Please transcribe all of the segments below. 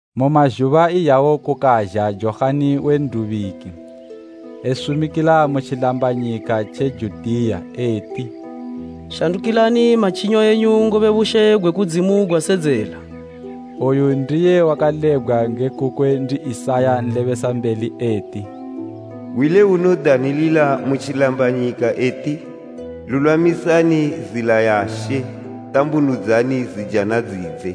Mu mazhuba iyawo kukazha Johani we N'dubiki, esumikila mu tjilambanyika tje Judiya eti, “Shandukilani matjinyo enyu ngobe bushe gwe kudzimu gwasedzela.” Oyu ndiye wakalebgwa nge kukwe ndi Isaya nlebesambeli eti, “Hwi le unodanilila mu tjilambanyika eti, ‘Lulwamisani zila ya She, tambunudzani zijana dzidze.’”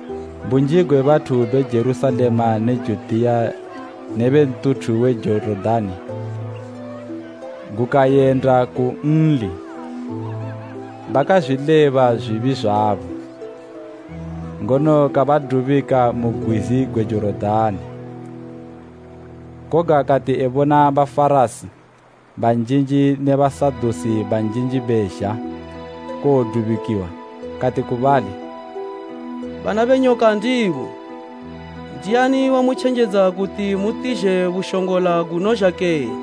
Bunji gwe bathu be Jerusalema ne Judiya ne be ntuthu we Jorodani, gukayenda kunli, bakazwileba zwibi zwabo, ngono kabadubika mu gwizi gwe Jorodani. Koga kati ebona Bafarasi banjinji bezha kuwodubikiwa, kati ku bali, “Bana be nyoka ndimwi! Ndiani wamutjenjedza kuti mutizhe bushongola gunozha kene?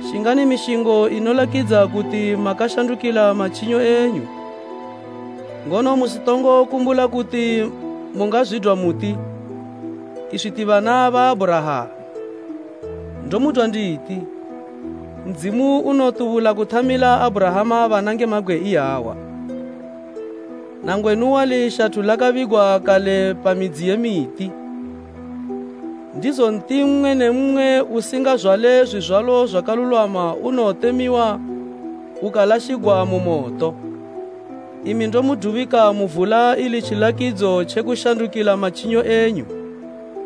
Shingani mishingo inolakidza kuti makashandukila matjinyo enyu. Ngono musitongo kumbula kuti mungazwidwa muti, ‘Iswi ti bana ba Abhurahama.’ Ndomudwa nditi, Ndzimu unotubula kuthamila Abhurahama bana nge mabgwe iyawa. Nangwenu wali shathu lakabigwa kale pa midzi ye miti, ndizo nti mmwe ne mmwe usingazwale zwizwalo zwakalulwama unowotemiwa ukalashigwa mu moto. Imi ndomudubika mu vula ili tjilakidzo tjekushandukila matjinyo enyu.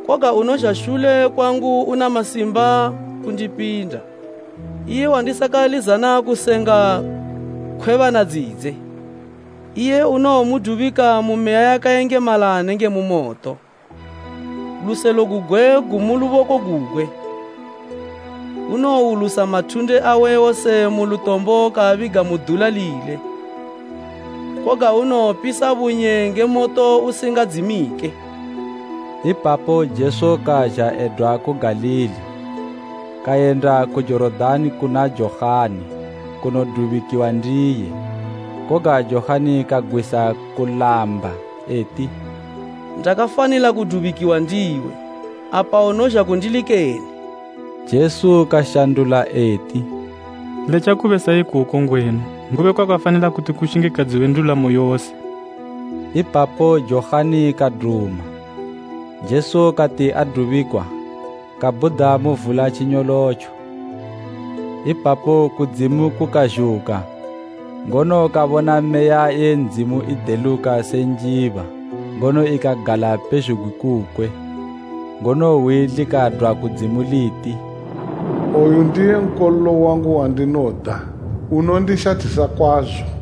Koga unozha shule kwangu una masimba kundipinda, iye wandisakalizana kusenga khwebana dzidze. Iye unowomudubika nge Meya yakayengemala nenge moto. Luselo Luselo: Baiziraela ibo banoshingisa harawu kuwulusa mathunde. gugwe gumu luboko gugwe, unowulusa mathunde awe wose mu lutombo kaabiga mu dula lile, koga unowopisa bunye nge moto usingadzimike.” Ipapo Jesu kazha edwa ku Galili, kayenda ku Jorodani kuna Johani kunodubikiwa ndiye. Koga Johani kagwisa kulamba, eti, “Ndakafanila kudubikiwa ndiwe, apa unozha kundili kene?” Jesu kashandula eti, “Letja kube sa ikoko ngwenu, ngobe kwakafanila kuti kushingikadziwe ndulamo yose.” Ipapo Johani kaduma. Jesu kati adubikwa kabhuda mu vula tjinyolotjo. Ipapo kudzimu kukazhuka ngono kabona Meya ye Ndzimu ideluka se njiba ngono ikagala pezhugwi kukwe. Ngono hwi likadwa kudzimu liti, “Oyu ndiye Nkololo wangu wandinoda, unondishathisa kwazo.”